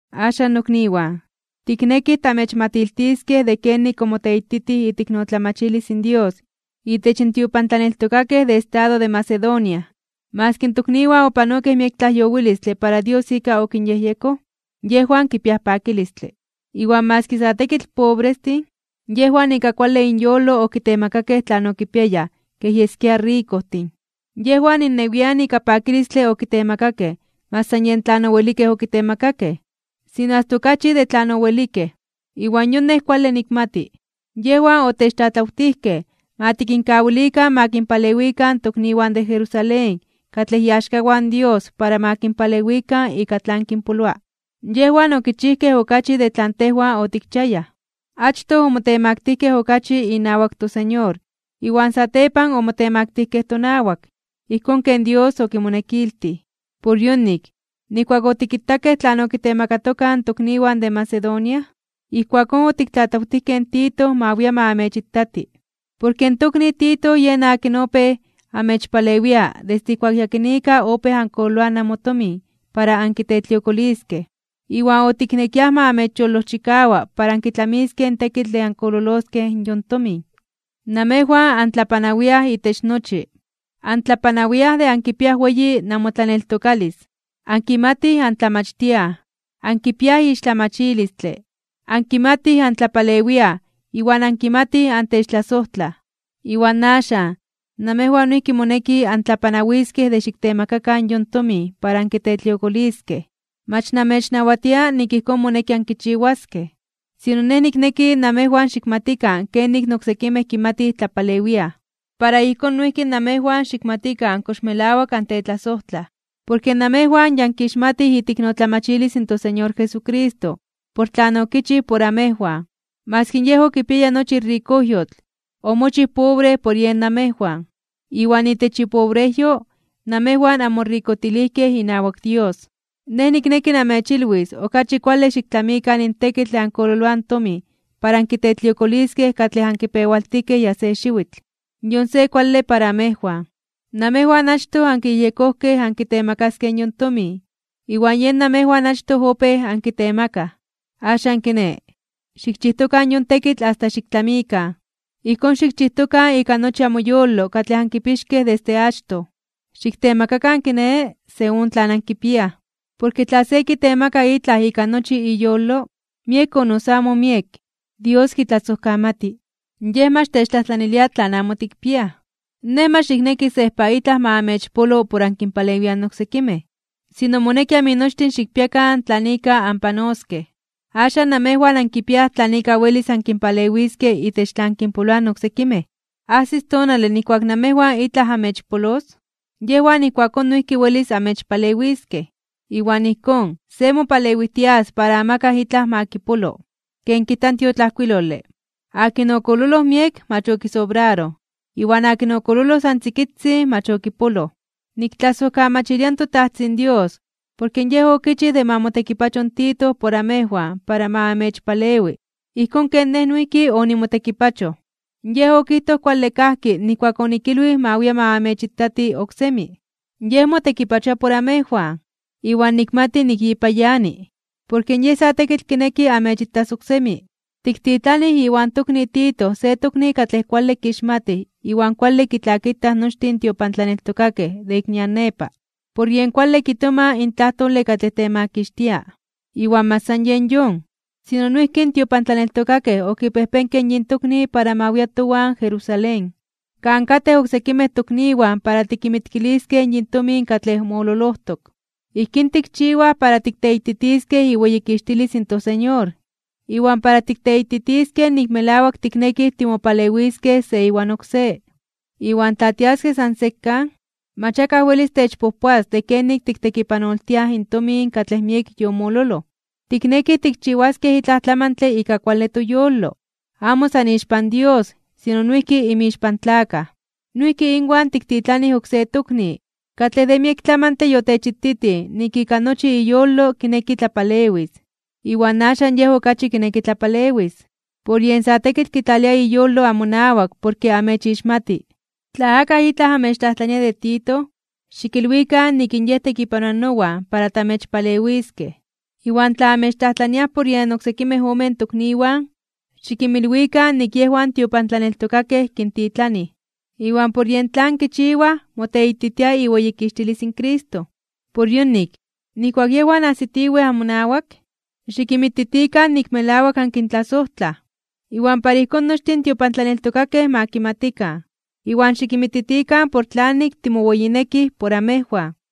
Axan nokniwan, tiknekij tamechmatiltiskej de kenik omoteititij iteiknotlamachilis in Dios itech in tiopantlaneltokakej de estado de Macedonia. Maski in tokniwan opanokej miek tlajyowilistle para Dios ika okinyejyekoj, yejwan kipiaj pakilistle. Iwan maski sa tekitl pobrestin, yejwan ika kuale inyolo okitemakakej tlan okipiayaj kej yeskia rikojtin. Yejwan innewian ika pakilistle okitemakakej mach san yen tlan owelikej okitemakakej, sino asta okachi de tlan owelikej. Iwan yon nej kuale nikmati. Yejwan otechtlatlawtijkej ma tikinkawilikan ma kinpalewikan tokniwan de Jerusalén katlej iaxkawan Dios para ma kinpalewikan ika tlan kinpoloa. Yejwan okichijkej okachi de tlan tejwan otikchiayaj. Achtoj omotemaktijkej (omotemaktilijkej) okachi inawak toSeñor, iwan satepan omotemaktijkej tonawak, ijkón ken Dios okimonekiltij. Por yonik, nijkuak otikitakej tlan okitemakatokaj in tokniwan de Macedonia, ijkuakón otiktlatlawtijkej in Tito ma wia ma amechitati. Porke in tokni Tito yen akin opéj amechpalewia desde ijkuak yakinika opéj ankololoaj namotomin para ankitetliokoliskej, iwan otiknekiaj ma amechyolojchikawa para ankitlamiskej in tekitl de ankololoskej yon tomin. Namejwan antlapanawiaj itech nochi: antlapanawiaj de ankipiaj weyi namotlaneltokalis, ankimatij antlamachtiaj, ankipiaj ixtlamachilistle, ankimatij antlapalewiaj iwan ankimatij antechtlasojtlaj. Iwan axan, namejwan noijki moneki antlapanawiskej de xiktemakakan yon tomin para ankitetliokoliskej. Mach namechnawatia nik ijkón moneki ankichiwaskej. Sino nej nikneki namejwan xikmatikan kenik in oksekimej kimatij tlapalewiaj, para ijkón noijki namejwan xikmatikan kox melawak antetlasojtlaj. Porke namejwan ya ankixmatij iteiknotlamachilis in toSeñor Jesucristo por tlan okichij por amejwan. Maski Yej okipiaya nochi rikojyotl, omochij pobre por yen amejwan, iwan itech ipobrejyo, namejwan anmorikojtilijkej inawak Dios. Nej nikneki namechilwis okachi kuale xiktlamikan in tekitl de ankololoaj in tomin para ankitetliokoliskej katlej ankipewaltijkej ya se xiwitl. Yon se kuale para amejwan. Namejwan achtoj ankiyejyekojkej ankitemakaskej yon tomin, iwan yen namejwan achtoj opéj ankitemakaj. Axan kiné, xikchijtokan yon tekitl asta xiktlamikan. Ijkón xikchijtokan ika nochi amoyolo katlej ankipixkej desde achtoj. Xiktemakakan kiné, según tlan ankipiaj. Porke tla se kitemaka itlaj ika nochi iyolo, miek o noso amo miek, Dios kitlasojkamati. Yej mach techtlajtlanilia tlan amo tikpiaj. Nej mach nikneki sejpa itlaj ma amechpolo por ankinpalewiaj oksekimej, sino moneki aminochtin xikpiakan tlan ika anpanoskej. Axan namejwan ankipiaj tlan ika welis ankinpalewiskej itech tlan kinpoloa in oksekimej. Ajsis tonale nijkuak namejwan itlaj amechpolos, yejwan ijkuakón noijki welis amechpalewiskej. Iwan ijkón, se mopalewijtias para amakaj itlaj ma kipolo. Ken kijta in tiotlajkuilole: “Akin okololoj miek mach okisobraroj. Iwan akin okololoj san tzikitzin (achitzin) mach okipoloj.” Niktlasojkamachilia in toTajtzin Dios, porke Yej okichij de ma motekipacho in Tito por amejwan para ma amechpalewi, ijkón ken nej noijki onimotekipachoj. Yej okijtoj kuale kajki nijkuak onikilwij ma wia ma amechitati oksemi. Yej motekipachoaj por amejwan, iwan nikmati nik yipa yani, porke yej sa tekitl kineki amechitas oksemi. Tiktitlanij iwan tokni Tito se tokni katlej kuale kixmatij iwan kuale kitlakitaj nochtin in tiopantlaneltokakej de ik nian nepa, por yen kuale kitoma in tlajtole katlej temakixtia. Iwan mach san yen yon, sino noijki in tiopantlaneltokakej okipejpenkej yin tokni para ma wia towan Jerusalén, kan katej oksekimej tokniwan para tikinmitkiliskej yin tomin katlej mololojtok. Ijkín tikchiwaj para tikteititiskej iweyikixtilis in toSeñor, iwan para tikteititiskej nik melawak tiknekij timopalewiskej se iwan oksé. Iwan tla tiaskej san sekan, mach akaj welis techpojpoas de kenik tiktekipanoltiaj in tomin katlej miek yomololoj. Tiknekij tikchiwaskej itlaj tlamantle ika kuale toyolo, amo san ixpan Dios, sino noijki inmixpan tlakaj. Noijki inwan tiktitlanij oksé tokni, katlej de miek tlamantle yotechititij nik ika nochi iyolo kineki tlapalewis. Iwan axan yej okachi kineki tlapalewis, porke yej sa tekitl kitlalia iyolo amonawak porke amechixmati. Tla akaj itlaj amechtlajtlania de Tito, xikilwikan nik in yej tekipanoa nowan para tamechpalewiskej. Iwan tla amechtlajtlaniaj por yen oksekimej omen tokniwan, xikinmilwikan nik yejwan tiopantlaneltokakej kintitlanij, iwan por yen tlan kichiwaj moteititia iweyikixtilis in Cristo. Por yonik, nijkuak yejwan ajsitiwej amonawak, xikinmititikan nik melawak ankintlasojtlaj, iwan para ijkón nochtin in tiopantlaneltokakej ma kimatikan. Iwan xikinmititikan por tlanik timoweyinekij por amejwan.